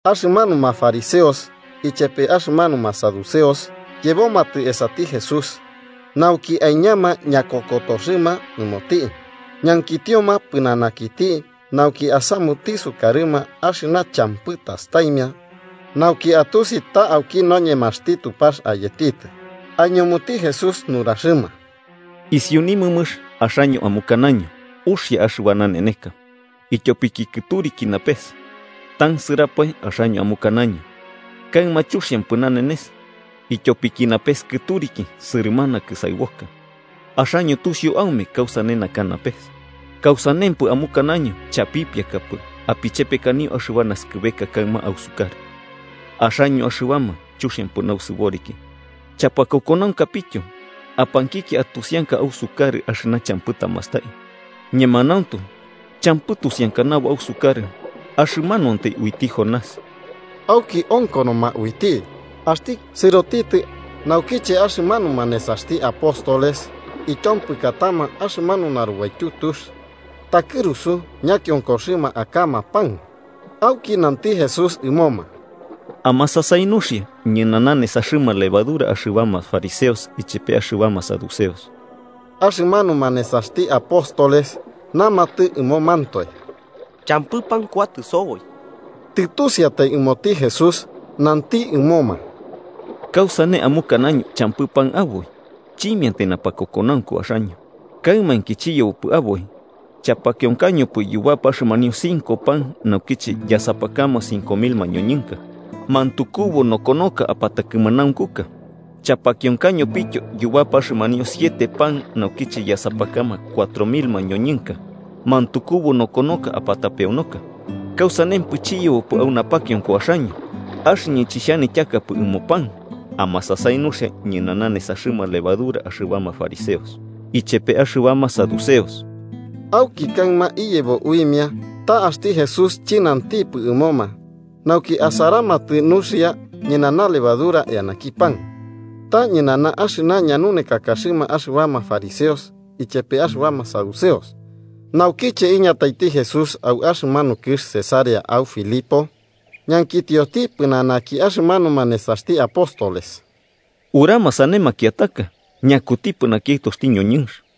Axɨmanuma fariseos ichepe axɨmanuma saduceos yebomatɨ esati Jesús, nauki aiñama ñakokotoxɨma ɨmoti, ñankitioma pɨnanakiti nauki asamuti sukarɨma axɨna champɨ tastaimia nauki atusi ta auki noñemaxti Tupax ayetitɨ. Aiñumuti Jesús nuraxɨma: “Isiu nimɨmɨx axaño amukanaño: ‘Uxia axɨba naneneka, ityopiki kɨturiki napes.’ Tansɨrapae axaño amukanaño: ‘Kaɨma chuxiampɨ nanenes, ityopiki napes kɨturiki sɨrɨmana kɨsaɨboka.’ Axaño tusiu aume kausane naka napes, ¿kausanempɨ amukanaño chapipiakapɨ apichepekanio axɨba naskɨbeka kaɨma ausukarɨ? Axaño axɨbama chuxiampɨ nausɨboriki chapakokonaunkapityo apankikia atusianka ausukarɨ axɨna champɨ tamastai. Ñemanauntu champɨ tusiankanabo ausukarɨ axɨmanuantai uiti Jonás.” Auki onkonoma uiti, axti sɨrotitɨ. Naukiche axɨmanuma nesaxti apóstoles ityompɨkatama axɨmanu narubaityu tux, takɨrusu ñakionkoxɨma akama pan. Auki nanti Jesús ɨmoma: –Amasasai nuxia, ñɨnana nesaxɨma levadura axɨbama fariseos ichepe axɨbama saduceos. Axɨmanuma nesaxti apóstoles namatɨ ɨmomantoe: –¡Champɨ pan kuatɨ soboi! Tɨtusiatai ɨmoti Jesús, nanti ɨmoma: –¿Kausane amukanaño champɨ pan aboi? ¡Chimiantai napakokonaunku axaño! ¿Kaɨmainki chiyebopɨ aboi, chapakionkañopɨ yubapa axɨmanio cinco pan naukiche yasapakama cinco mil mañoñɨnka, mantukubu nokonoka apatakɨmanaunkuka? ¿Chapakionkañopityo yubapa axɨmanio siete pan naukiche yasapakama cuatro mil mañoñɨnka, mantukubu nokonoka apatapeonoka? ¿Kausanempɨ chiyebopɨ au napakionko axaño axɨñɨ chixhanityakapɨ ɨmo pan? Amasasai nuxia ñɨnana nesaxɨma levadura axɨbama fariseos ichepe axɨbama saduceos. Auki kaɨma iyebo uimia ta axti Jesús chɨnantipɨ ɨmoma nauki asaramatɨ nuxia ñɨnana lebadura eanaki pan, ta ñɨnana axɨna ñanunekakaxɨma axɨbama fariseos ichepe axɨbama saduceos. Naukiche iñataiti Jesús au axɨmanu kɨx Cesarea au Filipo, ñankitioti pɨnanaki axɨmanuma nesaxti apóstoles: –¿Urama sane makiataka ñakutipɨ naki Aɨtoxti ñoñɨnx?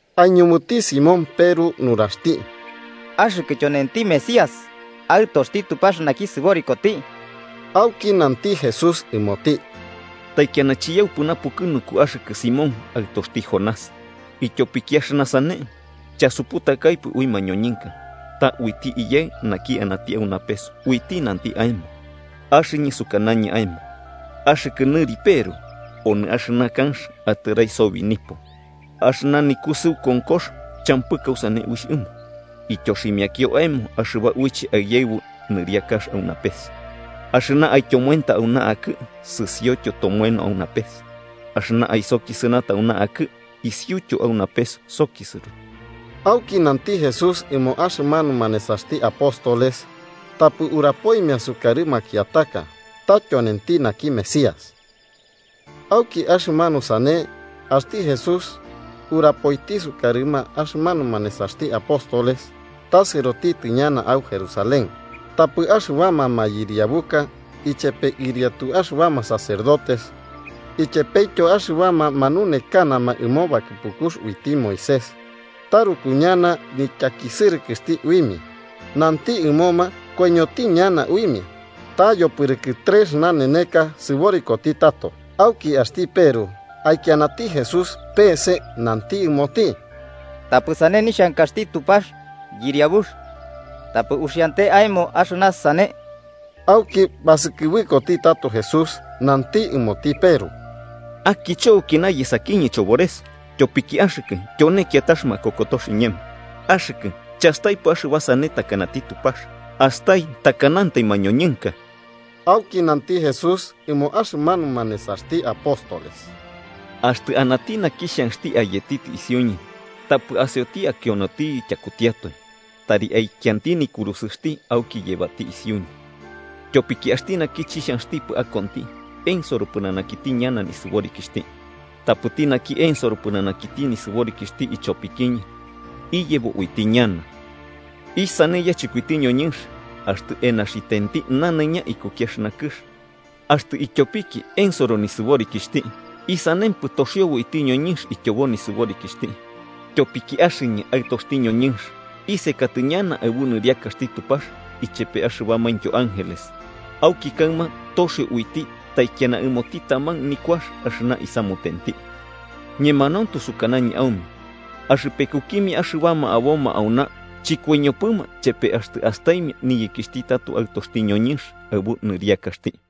Aiñumuti Simón Peru nuraxti: –Axɨkɨ tyonenti Mesías, Aɨtoxti Tupax naki sɨborikoti. Auki nanti Jesús ɨmoti: –Taikiana chiyaupɨ napukɨnunku axɨkɨ, Simón, aɨtoxti Jonás, ityopiki axɨna sane chasuputakaipɨ ui mañoñɨnka, ta uiti Iyaɨ naki anati au napes uiti nanti aemo. Axɨñɨ sukanañɨ aemo axɨkɨ nɨri Peru, onɨ axɨna kanx atɨrai sobi nipo. Axɨna nikusɨu konkox champɨ kausane uixh ɨmo. Ityoximiakio aemo axɨba uiche aiyaɨbu niriakax au napes. Axɨna aityomoenta auna akɨ'ɨ, sɨsiotyo tomoeno au napes, axɨna aisokisɨnata auna akɨ'ɨ, isiuityo au napes sokisɨro. Auki nanti Jesús ɨmo axɨmanuma nesaxti apóstoles tapɨ urapoimia sukarɨ makiataka ta tyonenti naki Mesías. Auki axɨmanu sane axti Jesús urapoiti sukarɨma axɨmanuma nesaxti apóstoles ta sɨrotitɨ ñana au Jerusalén, tapɨ axɨbama mayɨriabuka, ichepe ɨriatu axɨbama sacerdotes ichepetyo axɨbama manunekanama ɨmo bakɨpukux uiti Moisés taruku ñana nityakisɨrɨkɨxti uimia. Nanti ɨmoma koiñoti ñana uimia, ta yopɨrɨkɨ trex naneneka sɨborikoti tato. Auki axti Peru aikianati Jesús peese, nanti ɨmoti: –¡Tapɨ sane nixhankaxti Tupax, Yɨriabux, tapɨ uxiante aemo axɨna sane! Auki basɨkɨbɨkoti tato Jesús nanti ɨmoti Peru: –¡Akicho aukina yesakiñɨ, chobores, tyopiki axɨkɨ tyone kiatax makokotox iñemo! Axɨkɨ chastaipɨ axɨba sane takanati Tupax, astai takanantai mañoñɨnka. Auki nanti Jesús ɨmo axɨmanuma nesaxti apóstoles: –Axtɨ anati naki xhanxti ayetitɨ isiuñɨ, tapɨ asioti akionotiyɨ tyakutiatoi, tari aikianti nikurusɨxti auki yebati isiuñɨ. Tyopiki axti naki chixhanxtipɨ akonti, ensoro pɨnanakiti ñana nisɨborikixhti. Tapɨti naki ensoro pɨnanakiti nisɨborikixhti ichopikiñɨ, iyebo uiti ñana. ¿Isane yachɨkoiti ñoñɨnx axtɨ enaxitenti nanaiña ikuki axɨna kɨx, axtɨ ityopiki ensoro nisɨborikixhti? ¿Isanempɨ toxiobo uiti ñoñɨnx ityobo nɨsɨborikixhti? Tyopiki axɨñɨ Aɨtoxti ñoñɨnx isekatɨ ñana aɨbu niriakaxti Tupax ichepe axɨbamaintyo ángeles, auki kaɨma toxio uiti taikiana ɨmoti taman nikuax axɨna isamutenti. Ñemanauntu sukanañɨ aume axɨpekukimia axɨbama aboma auna chɨkoiñopɨma chepe axtɨ astaimia niyekixhti tato Aɨtoxti ñoñɨnx aɨbu nisɨriakaxti.